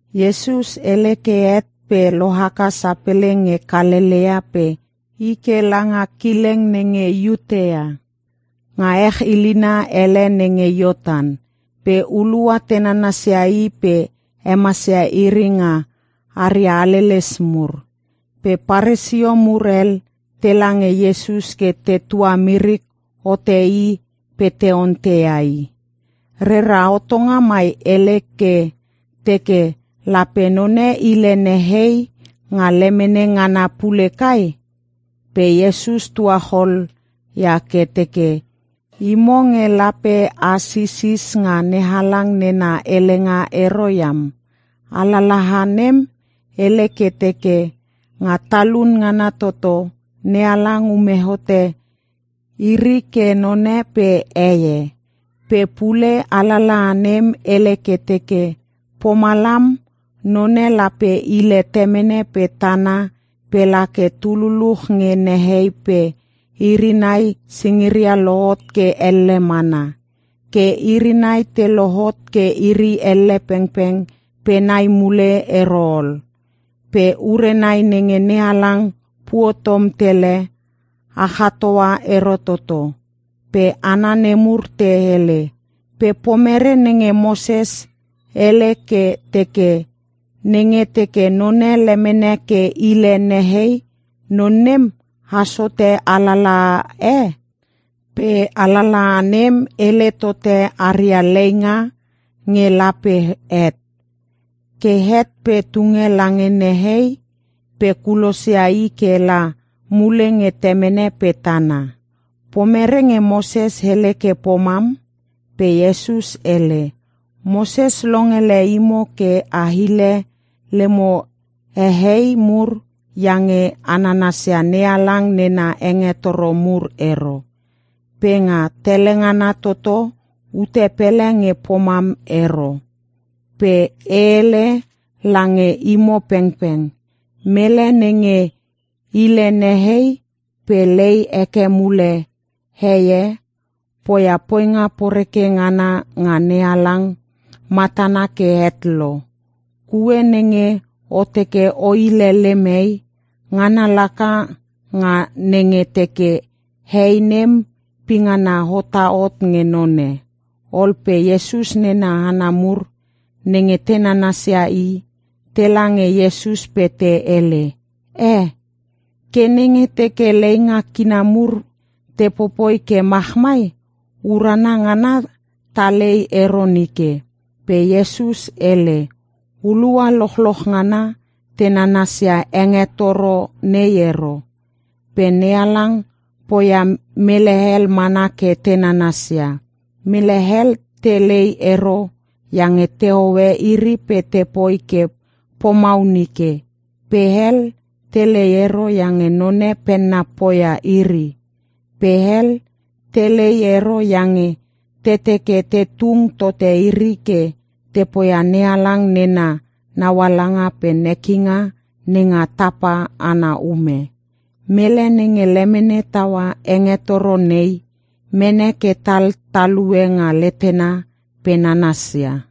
Iesus hele ke het pe lohaka sapele nge Kalelea pe i ke langa kileng nenge Iutea, nga ech ilina hele nenge Iortan. Pe hulua te nanasia I pe hemasia iri nga aria haleles mur. Pe Paresio mur hel tela nge Iesus ke te tuamirik hote i pe te onteia i, “Rera hotonga mai hele ke teke, lape none hile nehei nga lemene ngana pule kai?” Pe Iesus tuachol ia ke teke, “Imo nge lape a sisis nga NeHalang nena helenga ero iam. Alalaha nem hele ke teke, ‘Nga talun ngana toto, NeHalang ume hote iri ke none pe heie.’ Pe pule alalaha nem hele ke teke, ‘Pomalam, none lape hile temene pe tana pe la ke tululuch nge nehei pe iri nai singiria lohot ke elle mana.’ Ke iri nai te lohot ke iri elle pengpeng pe nai mule ero ol. Pe ure nai nenge NeHalang puotom tele, a chatoa ero toto.” Pe hana nemur te hele, “Pe pomere nenge Moses hele ke teke, nenge teke none lemene ke hile nehei, non nem as hote alalaha e? Pe alalaha nem hele tote aria leinga nge lape het. Ke het pe tunge lange nehei pe kulosia i ke la mule nge temene pe tana. Pomere nge Moses hele ke pomam?” Pe Iesus hele, “Moses longele imo ke a hile lemo hehei mur iange a nanasia NeHalang nena hengetoro mur ero. Pe nga tele ngana toto ute pele nge pomam ero. Pe e hele lange imo pengpeng, mele nenge hile nehei pe lei heke mule hei e, poia poinga poreke ngana nga NeHalang matana ke het lo. Kue nenge o teke o hile lem hei, ngana laka nga nenge teke hei nem pingana hota hot nge none.” Ol pe Iesus nena hana mur nenge te nananasia I, tela nge Iesus pe te hele, “Eh, ke nenge teke leinga kina mur te popoi ke machmai, urana ngana ta lei ero nike.” Pe Iesus hele, “Hulua lochloch ngana te nanasia hengetoro nei ero. Pe NeHalang poia mele hel mana ke te nanasia. Mele hel te lei ero iange te hoe iri pe te poi ke pomau nike. Pe hel, te lei ero iange none penna poia iri. Pe hel, te lei ero iange te teke te tung tote iri ke te poia NeHalang nena naualanga pe nekinga nenga tapa ana ume. Mele nenge lemene taua hengetoro nei, mene ke tal talue nga letena pe nanasia.”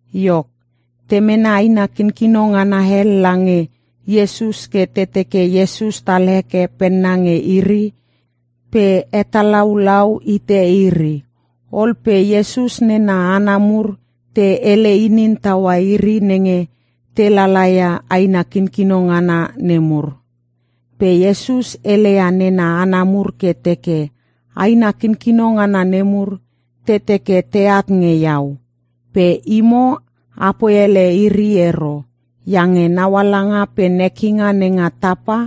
Iok, te mene aina kinkino ngana hel lange Iesus ke te teke Iesus tal heke penna nge iri pe hetalaulau hite iri. Ol pe Iesus nena hana mur te hele inin taua iri nenge te lala ia aina kinkino ngana nemur. Pe Iesus heleia nena hana mur ke teke, “Aina kinkino ngana nemur te teke teat nge Iau. Pe imo, apoi hele iri ero. Iange naualanga pe nekinga nenga tapa,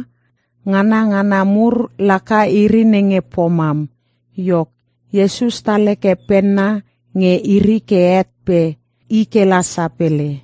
nganangana mur laka iri nenge pomam.” Iok, Iesus tal heke penna nge iri ke het pe i kela sapele.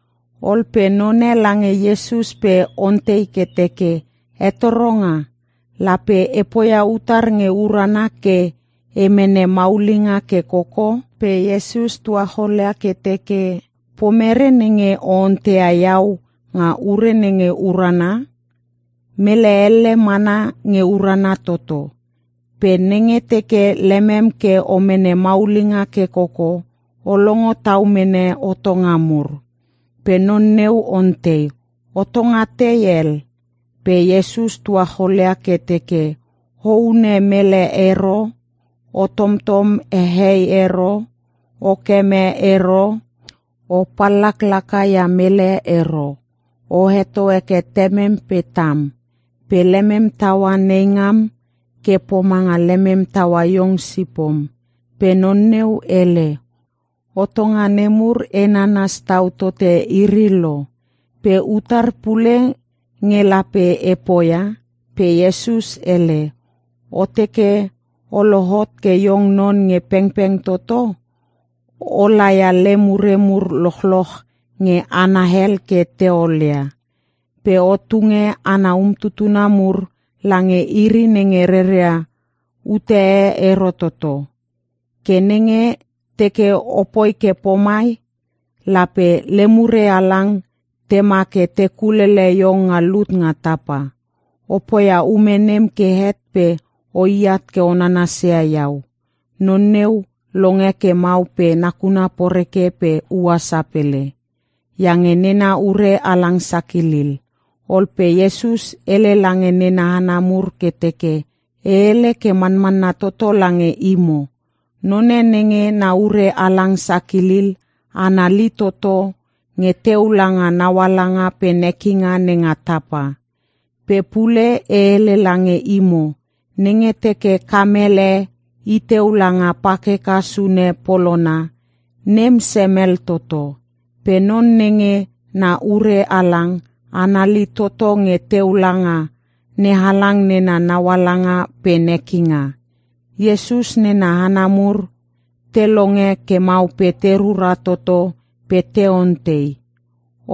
Ol pe none lange Iesus pe ontei ke teke, “Hetoronga, lape e poia utar nge urana ke e mene maulinga ke koko?” Pe Iesus tuachol ia ke teke, “Pomere nenge o onteia Iau nga ure nenge urana? Mele elle mana nge urana toto. Pe nenge teke lemem ke o mene maulinga ke koko, o longo tau mene hotonga mur.” Pe non neu ontei, “Hotonga tei hel?” Pe Iesus tuacholia ke teke, “‘O hune mele ero. O tomtom hehei ero. O keme ero. O pallaklaka ia mele ero. O heto heke temem pe tam. Pe lemem taua neingam ke pomanga lemem taua iong sipom.’” Pe non neu hele, “Hotonga nemur e nanas tau tote iri lo. Pe utar pule nge lape e poia?” Pe Iesus hele, “O teke o lohot ke iong non nge pengpeng toto, o laia lem ure mur lochloch nge hana hel ke te olia, pe o tunge ana umtutuna mur lange iri nenge reria ute e ero toto. Ke nenge teke o poi ke pomai, lape lem ure halang tema ke te kulele iong nga lut nga tapa. O poia ume nem ke het pe o iat ke o nanasia Iau.” Non neu longe ke mau pe nakuna poreke pe ua sapele, iange nena ure halang sakilil. Ol pe Iesus hele lange nena hana mur ke teke, “E hele ke manmanna toto lange imo. None nenge na ure halang sakilil, anali toto nge teu langa naualanga pe nekinga nenga tapa. Pe pule e hele lange imo, nenge teke kamel e i teu langa pakeka sune polona, nem semel toto. Pe non nenge na ure halang, anali toto nge teu langa NeHalang nena naualanga pe nekinga.” Iesus nena hana mur te longe ke mau pe te rura toto pe te ontei,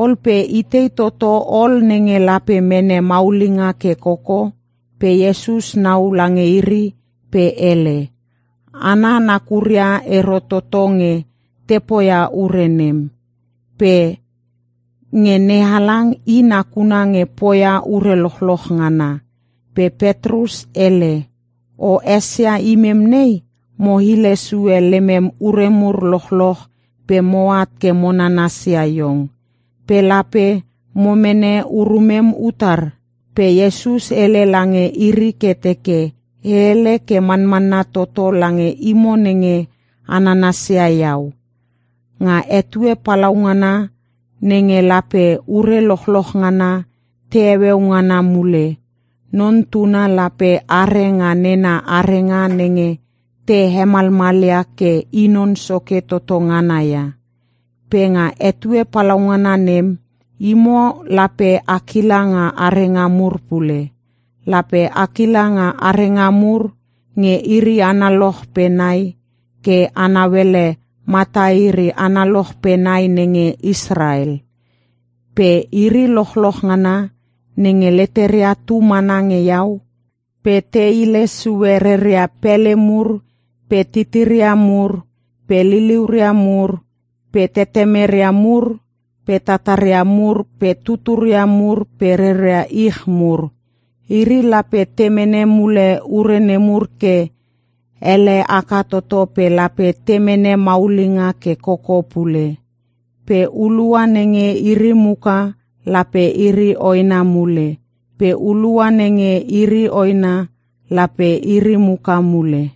“Ol pe itei toto ol nenge lape mene maulinga ke koko?” Pe Iesus nau lange iri pe hele, “Hana nakuria ero toto nge te poia ure nem. Pe nge NeHalang, i nakuna nge poia ure lochloch ngana.” Pe Petrus hele, “O esia imem nei, mo hile sue lemem ure mur lochloch pe moat ke mo nananasia iong. Pe lape mo mene urumem utar?” Pe Iesus hele lange iri ke teke, “E hele ke manmanna toto lange imo nenge a nanasia iau. Nga etue palaungana nenge lape ure lochloch ngana te heueu ngana mule, Non Tuna lape are nga nena arenga nenge te hemalmalia ke I Non Soke toto ngana ia. Pe nga etue palaungana nem, imo lape a kila nga arenga mur pule. Lape a kila nga arenga mur nge iri analoch pe nai ke a nauele mata iri analoch pe nai nenge Israel. Pe iri lochloch ngana nenge leteria tu mana nge Iau pe te hile sue reria pele mur pe titiria mur pe liliuria mur pe tetemeria mur pe tataria mur pe tuturia mur pe reria ich mur, iri lape te mene mule ure nemur ke ele haka toto pe lape te mene maulinga ke koko pule. Pe hulua nenge iri muka lape iri hoena mule, pe hulua nenge iri hoena lape iri muka mule.”